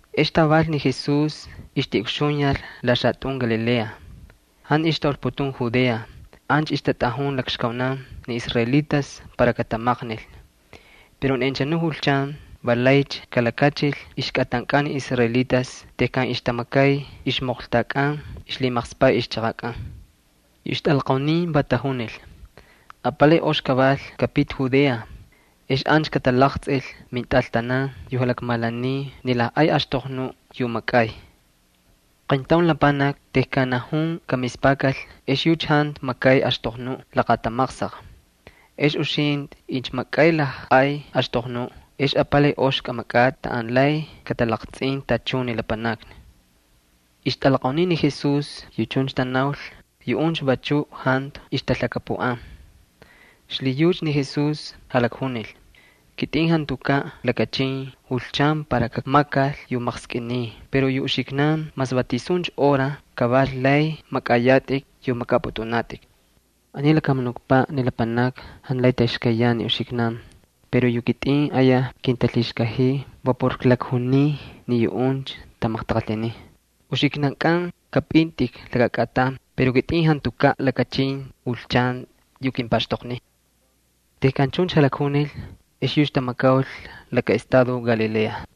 Ex taval ni Jesús ixtiꞌukxuyal la xalakatꞌun Galilea. Jantu ixtaulputun Judea, ancha ixtatꞌajun lakxkaunan niisraelitas para katamaqnil. Pero ni anchanu julchan va laycha kalakachil ixkꞌatankꞌan ni israelitas tejkan ixtamakay ixmoqltakꞌan ixlhimaqspaꞌ ixchaqakꞌan. Yu ixtꞌalaqaunin va tajunil: —Apalay ox kaval kꞌapiti Judea. Ex ancha katalaqtsꞌil mintꞌaltanan ni lajꞌay axtoqnuꞌ yu makꞌay. Qayntaun lapanaki tejkan najun kamispakal ex yucha jantu makay axtoqnuꞌ laqatamaqsaq. Ex uxintꞌi incha makꞌay lajꞌay axtoqnuꞌ ex apalay ox kꞌamakꞌatꞌi taꞌan lay katalaqtsꞌin tachun ni lapanakni. Ixtꞌalaqaunin ni Jesús yu chuncha tanaul, yuꞌuncha vachuꞌ jantu ixtalhakapuꞌan. Xlhiyucha ni Jesús jalakjunil: —Kitꞌin jantukaꞌ lakachin julchan para kakmakal yu maqskꞌiniy pero yu uxiknan mas va tisuncha hora kaval lay makꞌayatꞌik yu makꞌapꞌutꞌunatꞌik. Aniy lakamunukpaꞌ ni lapanakni jantu lay taxkayyan ni uxiknan pero yu kitꞌin ayaj kintalhixkajiy va por klakjuniy ni yuꞌuncha tamaqtaqalhinin. Uxiknankꞌan kapꞌintꞌik laka kꞌatan pero kitꞌin jantukaꞌ. Jantukaꞌ lakachin julchan yu kimpaxtoqniy. Tejkan chuncha jalakjunil ex yucha tamakaul laka estado Galilea.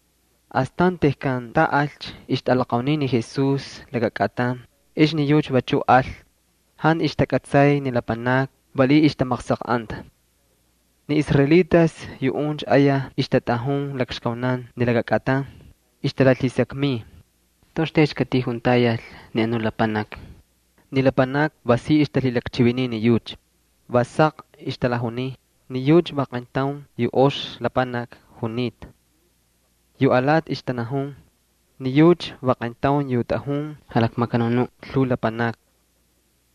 Astan tejkan taꞌalcha ixtꞌalaqaunin ni Jesús laka kꞌatan ex ni yucha vachuꞌ al. Jantu ixtakꞌatsay ni lapanakni, valiꞌiy ixtamaqsaqꞌanta. Ni israelitas yuꞌuncha ayaj ixtatꞌajun lakxkaunan ni laka kꞌatan. Ixtalalhisakmiy: —¿Toꞌoxtaycha katijuntayal ni anuꞌ lapanaki? Ni lapanakni va si ixtalhilakchiviniy ni yucha. Va saq ixtalajuniy: “Ni yucha va qayntaun yu ox lapanaki junita.” Yu alati ixtanajun: “Ni yucha va qayntaun yu tꞌajun jalakmakanun lhuu lapanakni.”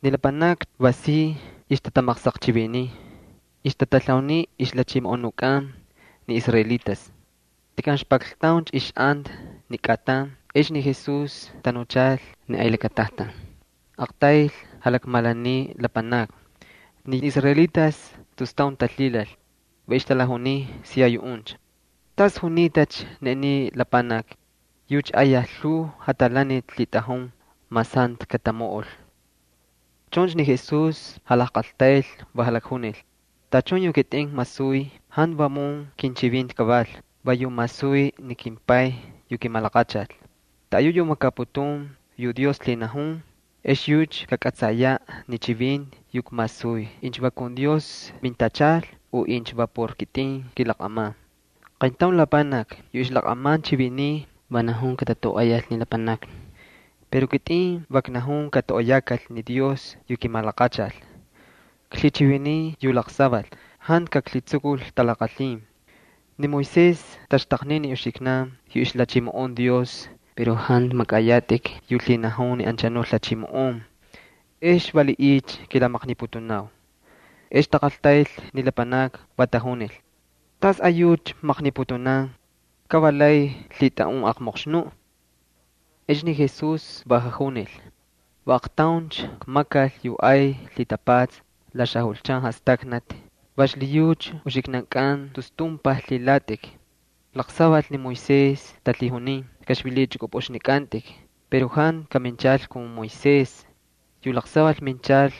Ni lapanakni va si ixtatamaqsaqchiviniy, ixtatalhauniy ixjalhachimoꞌonunkꞌan ni israelitas. Tejkan ixpakltauncha ixꞌanta ni kꞌatan ex ni Jesús tanuchal ni ay lakatajtan. Aqtayl jalakmalaniy ni lapanakni. Ni israelitas tus taun talhilal, va ixtalajuniy siya yuꞌuncha: —¿Tas junitacha ni aniy lapanaki? Yucha ayaj lhuu jatalaniti lhitꞌajun mas jantu katamoꞌol. Chuncha ni Jesús jalajqaltayl, va jalakjunil: —Tachun yu kitꞌin kmasuy jantu vamun kinchivinti kaval. Va yu masuy ni kimPay yu kimalaqachal. Taꞌayu yu makaputun yu Dios lhinajun ex yucha kakꞌatsayaꞌ ni chivinti yu kmasuy incha va kun Dios mintachal u incha va por kitꞌin kilaqꞌaman. Qayntaun lapanaki yu ixlaqꞌaman chiviniy va najun katatoꞌoyal ni lapanakni. Pero kitꞌin va knajun katoꞌoyakal ni Dios yu kimalaqachal. Klhichiviniy yu laqsaval, jantu kaklhitsukul talaqalhin. ’Ni Moisés taxtaqnin ni uxiknan yu ixlhachimoꞌon Dios pero jantu makꞌayatꞌik yu lhinajun ni anchanu lhachimoꞌon. ¿Ex valiꞌiycha kilamaqniputunau? Ex taqaltayl ni lapanakni, va tajunil: —¿Tasꞌayucha maqniputunan? Ka va lay lhitꞌaꞌun aqmoqxnuꞌ. Ex ni Jesús va jajunil: —Va aqtauncha kmakal yu ay lhitapatsa la xajulchan jastaknati, va xlhiyucha uxiknankꞌan tus tumpaj lhilatꞌik. Laqsaval ni Moisés talhijunin kꞌaxvililichꞌukꞌupꞌuxnikꞌantꞌik pero jantu kaminchal kun Moisés. Yu laqsaval minchal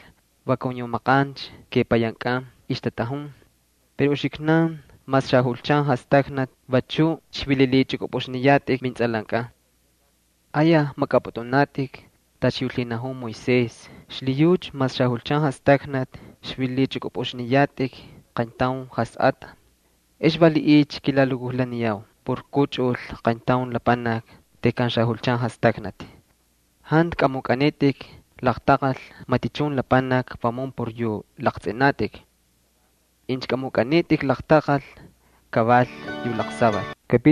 va kun yu apalay maqancha kepayankꞌan ixtatꞌajun. Pero uxiknan mas xajulchan jastaknati vachuꞌ xvililichꞌukꞌupꞌuxniyatꞌik mintsꞌalankꞌan. Ayaj makꞌapꞌutꞌunatꞌik tacha yu lhinajun Moisés xlhiyucha mas xajulchan jastaknati xvililichꞌukꞌupꞌuxniyatꞌik qayntaun jasꞌatꞌa. ¿Ex valiꞌiycha kilalukujlaniyau por kꞌuchꞌul qayntaun lapanaki tejkan xajulchan jastaknati? Jantu kꞌamukꞌanitꞌik laqtaqal matichun lapanaki vamun por yu laqtsꞌinatꞌik. Incha kꞌamukꞌanitꞌik laqtaqal kaval yu laqsaval.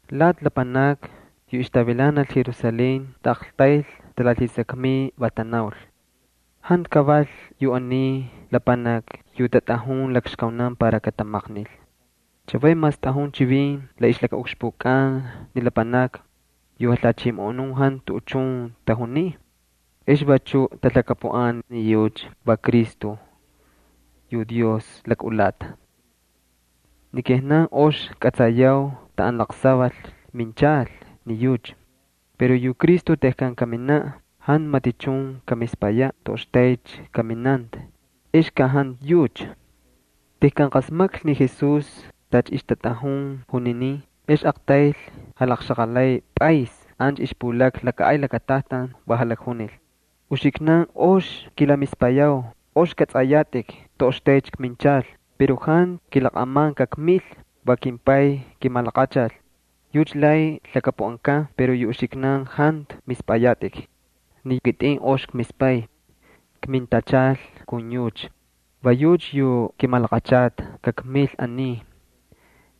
Lati lapanakni yu ixtavilanal Jerusalén taꞌaqtayl talalhisakmiy, va tanaul: —¿Jantu kaval yu aniy lapanaki yu tatꞌajun lakxkaunan para katamaqnil? Chavay mas tꞌajun chivin la ixlakaꞌukxpukꞌan ni lapanakni, yu lhachimoꞌonun jantu tuꞌuchun tajuniy. ¿Ex vachu talhakapuꞌan ni yucha va Cristo yu Dios lakꞌulata? Ni kijnan ox kꞌatsayau taꞌan laqsaval minchal ni yucha. Pero yu Cristo tejkan kaminaꞌ jantu matichun kamispayaꞌ toꞌoxtaycha kaminanta, ex ka jantu yucha. Tejkan qasmaklhi ni Jesús tacha ixtatꞌajun juninin, ex aqtayl jalaqxaqalay pꞌaysni ancha ixpulakna laka ay lakatajtan, va jalakjunil: —Uxiknan ox kilamispayau, ox kꞌatsꞌayatꞌik toꞌoxtaycha kminchal. Pero jantu kilaqꞌaman kakmil. Va kimPay kimalaqachal. Yucha najun yu laqsaval pero yu uxiknan jantu mispꞌayatꞌik. Ni kitꞌin ox kmispay. Kmintachal kun yucha, va yucha yu kimalaqachal kakmil aniy.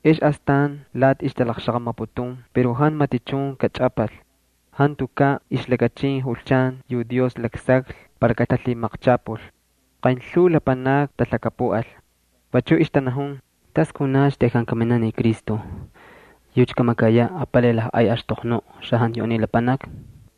Ex astan lati ixtalaqxaqamaputun pero jantu matichun kachꞌapal. Jantukaꞌ ixlakachin julchan yu Dios laksaklhi para katalhimaqchapul. Qaynlhuu lapanakni talhakapuꞌal. Vachuꞌ ixtanajun: —¿Tas kunacha tejkan kaminaꞌ ni Cristo? ¿Kamakayaꞌ ni yucha apalay lajꞌay axtoqnu xajantu yu aniy lapanaki?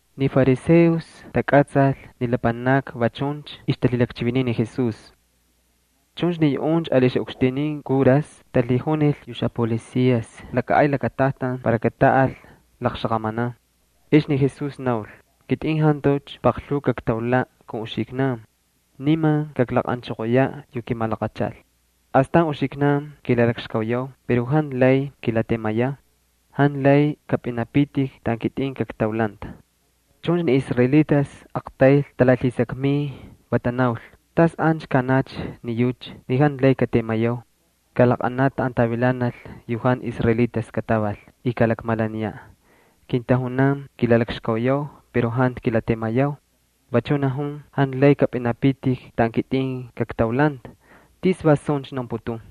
Ni fariseos takꞌatsal ni lapanakni va chuncha ixtalhilakchiviniy ni Jesús. Chuncha ni yuꞌuncha ali yu xaꞌukxtinin kuras talhijunil yu xapolicias ni ay lakatajtan para kataꞌal laqxaqamanan. Ex ni Jesús naul: —Kitꞌin jantucha paqlhuu kaktaulaꞌ kun uxiknan. Niman kaklaqꞌanchoqoyaꞌ yu kimalaqachal. Astan uxiknan kilalakxkauyau pero jantu lay kilatemayau. Jantu lay kapꞌinapitik taꞌan kitꞌin kaktaulanta. Chuncha ni israelitas aqtayl talalhisakmiy, va tanaul: —¿Tas ancha kaꞌanacha ni yucha ni jantu lay katemayau? ¿Kalaqꞌanaꞌ taꞌan tavilanal yu jantu israelitas kataval y kalakmalaniyaꞌ? Kintajunan “Kilalakxkauyau pero jantu kilatemayau.” Vachu najun “Jantu lay kapꞌinapitik taꞌan kitꞌin kaktaulanta.” ¿Tis va suncha naunputun?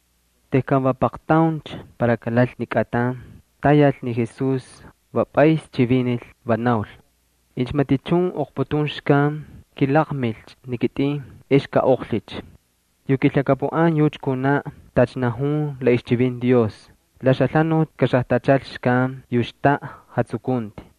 Tejkan va paqtauncha para kalal ni kꞌatan, tayal ni Jesús, va pꞌays chivinil, va naul: —Incha matichun oqputun xkan, kilaqmilcha ni kitꞌin ex kaꞌoqlhicha. Yu kilhakapuꞌan yucha kunaꞌ tacha najun la ixchivinti Dios: “La xalhanuti kaxajtachal xkan yu xtaꞌa jatsukunti.”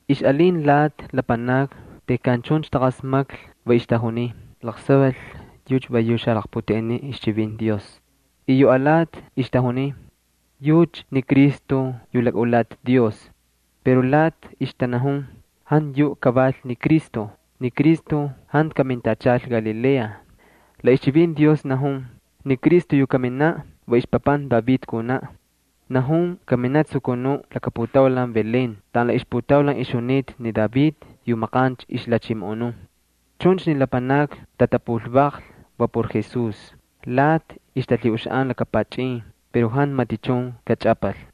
Ixꞌalin lati lapanakni tejkan chuncha taqasmaklhi, va ixtajuniy: —Laqsaval, yucha va yu xalaqputeꞌeniꞌ ixchivinti Dios. Y yu alati ixtajuniy: —Yucha ni Cristo yu lakꞌulata Dios. Pero lati ixtanajun: —Jantu yuꞌ kaval ni Cristo. Ni Cristo jantu kamintachal Galilea. La ixchivinti Dios najun ni Cristo yu kaminaꞌ va ixpapanti David kunaꞌ. Najun kaminaꞌ tsukunuꞌ laka putaulan Belén taꞌan la ixputaulan ixjunita ni David yu maqancha ixlhachimoꞌonun. Chuncha ni lapanakni tatapulvaqlhi va por Jesús. Lati ixtalhiꞌuxaꞌan laka pachꞌin pero jantu matichun kachꞌapal.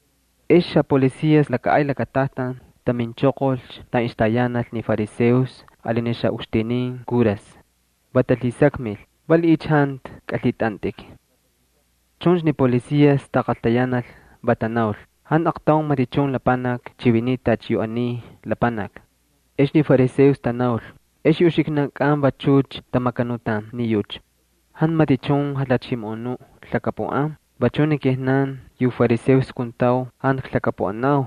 Ex yu xapolicias laka ay lakatajtan taminchoqolcha taꞌan ixtayanal ni fariseos ali ni xaꞌukxtinin kuras. Va talhisakmil: —¿Valiꞌiycha jantu kꞌalhitꞌantꞌik? Chuncha ni policias taqaltayanal, va tanaul: —Jantu aqtaun matichun lapanaki chiviniy tacha yu aniy lapanaki. Ex ni fariseos tanaul: —¿Ex yu uxiknankꞌan vachucha tamakanutan ni yucha? Jantu matichun jalhachimoꞌonuꞌ lhakapuꞌan. Vachuꞌ ni kijnan yu fariseos kuntau jantu klhakapuꞌanau.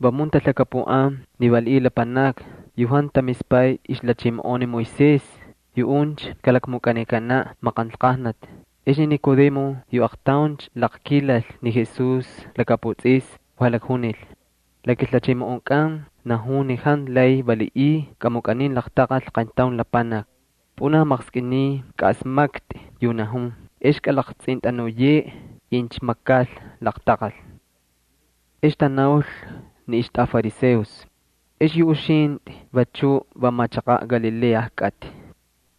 Vamun talhakapuꞌan ni valiꞌiy lapanakni yu jantu tamispay ixlhachimoꞌon ni Moisés. Yuꞌuncha kalakmukꞌanikanaꞌ maqanlqajnati. Ex ni Nicodemo yu aqtauncha laqkilal ni Jesús lakaputsꞌisni va jalakjunil: —La kilhachimoꞌonkꞌan najun ni jantu lay valiꞌiy kꞌamukꞌanin laqtaqal qayntaun lapanaki. Pꞌunaj maqskꞌiniy kaꞌasmaktꞌi yu najun ex kꞌalaqtsꞌintꞌanuyeꞌe incha makal laqtaqal. Ex tanaul ni ixtꞌafariseos: —¿Ex yu uxintꞌi vachu va machaqaꞌ Galilea kꞌatꞌi?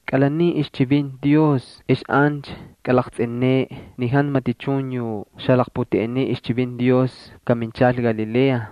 Kꞌalanin ixchivinti Dios ex ancha kꞌalaqtsꞌineꞌe ni jantu matichun yu xalaqputeꞌeniꞌ ixchivinti Dios kaminchal Galilea. [